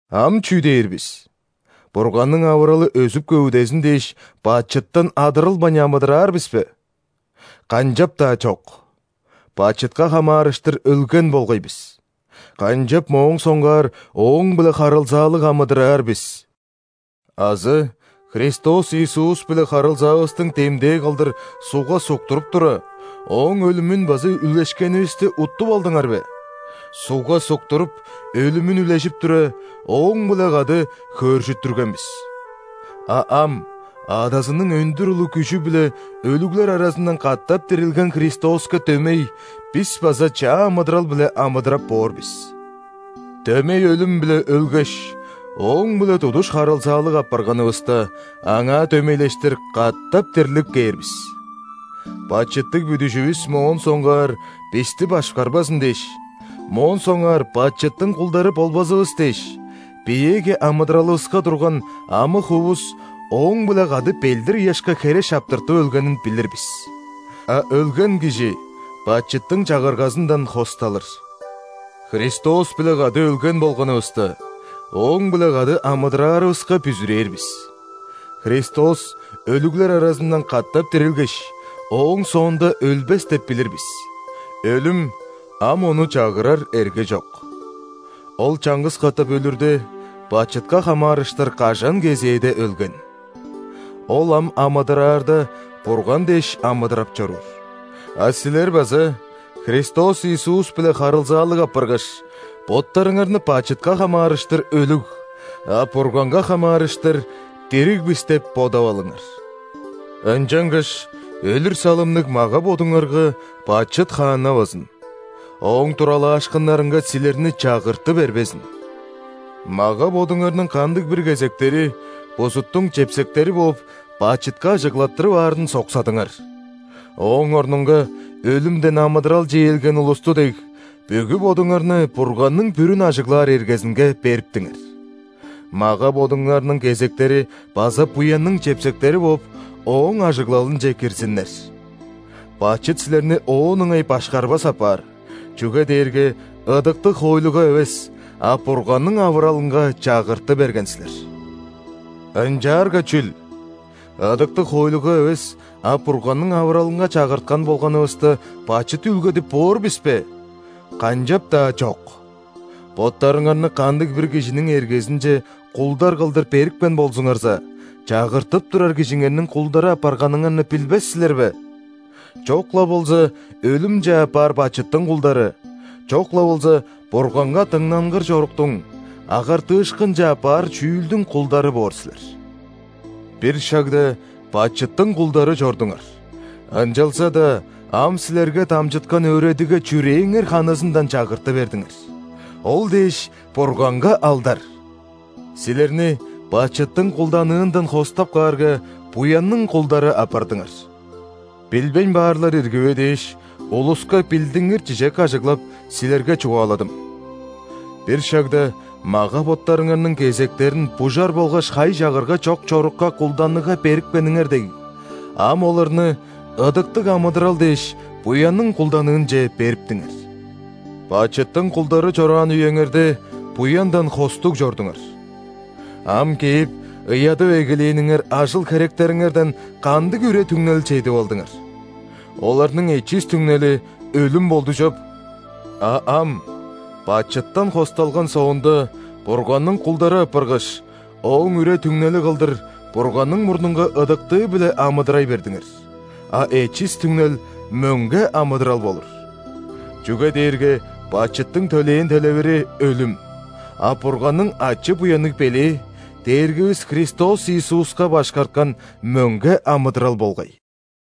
Ам чүү дээр бис? Бурганның авыралы өзүп-көвүдезин дээш, бачыттан адырылбайн амыдыраар бис бе? – Канчап-даа чок! Бачытка хамаарыштыр өлген болгай бис, канчап моон соңгаар ооң-биле харылзаалыг амыдыраар бис? Азы Христос Иисус-биле харылзаавыстың демдээ кылдыр ·сугга суктуруп тура, Ооң өлүмүн база үлешкенивисти уттуп алдыңар бе? Сугга суктуруп – өлүмүн үлежип тура, Ооң-биле кады хөөржүттүрген бис. А ам, Адазының өндүр улуг күжү-биле өлүглер аразындан катап дирилген Христоска дөмей, бис база чаа амыдырал-биле амыдырап боор бис. Дөмей өлүм-биле өлгеш, Ооң-биле тудуш харылзаалыг апарганывыста, Аңаа дөмейлештир катап дирлип кээр бис! Бачыттыг бүдүжүвүс моон соңгаар бисти башкарбазын дээш, моон соңгаар бачыттың кулдары болбазывыс дээш, биеэги амыдыралывыска турган амы-хуувус Ооң-биле кады ·белдир-ыяшка хере шаптыртып өлгенин билир бис. А өлген кижи бачыттың чагыргазындан хосталыр. Христос-биле кады өлген болганывыста, Ооң-биле кады амыдыраарывыска бүзүрээр бис. Христос өлүглер аразындан катап дирилгеш, ооң соонда өлбес деп билир бис: өлүм ам Ону чагырар эрге чок Ол чаңгыс катап өлүрде, бачытка хамаарыштыр кажан кезээде өлген. Ол ам амыдыраарда, Бурган дээш амыдырап чоруур. А силер база, Христос Иисус-биле харылзаалыг апаргаш, боттарыңарны бачытка хамаарыштыр – өлүг, а Бурганга хамаарыштыр – дириг бис деп бодап алыңар. Ынчангаш өлүр салымныг мага-бодуңарга бачыт хааннавазын, ооң туралаашкыннарынга силерни чагырты бербезин. Мага-бодуңарның кандыг-бир кезектери, бузуттуң чепсектери бооп, бачытка ажыглаттырып аарын соксадыңар. Ооң орнунга, өлүмден амыдыралче ээлген улусту дег, бүгү бодуңарны Бурганның бүрүн ажыглаар эргезинге бериптиңер. Мага-бодуңарның кезектери база буянның чепсектери бооп, Ооң ажыглалынче кирзиннер. Бачыт силерни оон ыңай башкарбас апаар, чүге дээрге ыдыктыг хоойлуга эвес, а Бурганның авыралынга чагырты берген силер. – Ынчаарга чүл? Ыдыктыг хоойлуга эвес, а Бурганның авыралынга чагырткан болганывыста, бачыт үүлгедип боор бис бе? – Канчап-даа чок! Боттарыңарны кандыг-бир кижиниң эргезинче кулдар кылдыр берипкен болзуңарза, чагыртып турар кижиңерниң кулдары апарганыңарны билбес силер бе? Чок-ла болза өлүмче аппаар бачыттың кулдары, чок-ла болза Бурганга дыңнангыр чоруктуң – агартыышкынче аппаар чүүлдүң кулдары боор силер. Бир шагда бачыттың кулдары чордуңар, ынчалза-даа ам силерге дамчыткан өөредигге чүрээңер ханызындан чагырты бердиңер. Ол дээш, Бурганга алдар! Силерни бачыттың кулданыындан хостап каарга, буянның кулдары апардыңар. (Билбейн баарлар ирги бе дээш, улуска билдингир чижек ажыглап, силерге чугааладым.) Бир шагда мага-боттарыңарның кезектерин бужар болгаш хай-чагырга чок чорукка кулданыгга берипкениңер дег, ам оларны ыдыктыг амыдырал дээш буянның кулданыынче бериптиңер. Бачыттың кулдары чораан үеңерде, буяндан хостуг чордуңар. Ам кээп ыядып эгелээниңер ажыл-херектериңерден кандыг үре-түңнел чедип алдыңар? Оларның эчис түңнели өлүм болду чоп. А ам, бачыттан хосталган соонда, Бурганның кулдары апаргаш, ооң үре-түңнели кылдыр Бурганның мурнунга ыдыктыы-биле амыдырай бердиңер; а эчис түңнел – мөңге амыдырал болур. Чүге дээрге бачыттың төлээн төлевири – өлүм, а Бурганның ачы-буянныг белээ – Дээргивис Христос Иисуска башкарткан мөңге амыдырал болгай.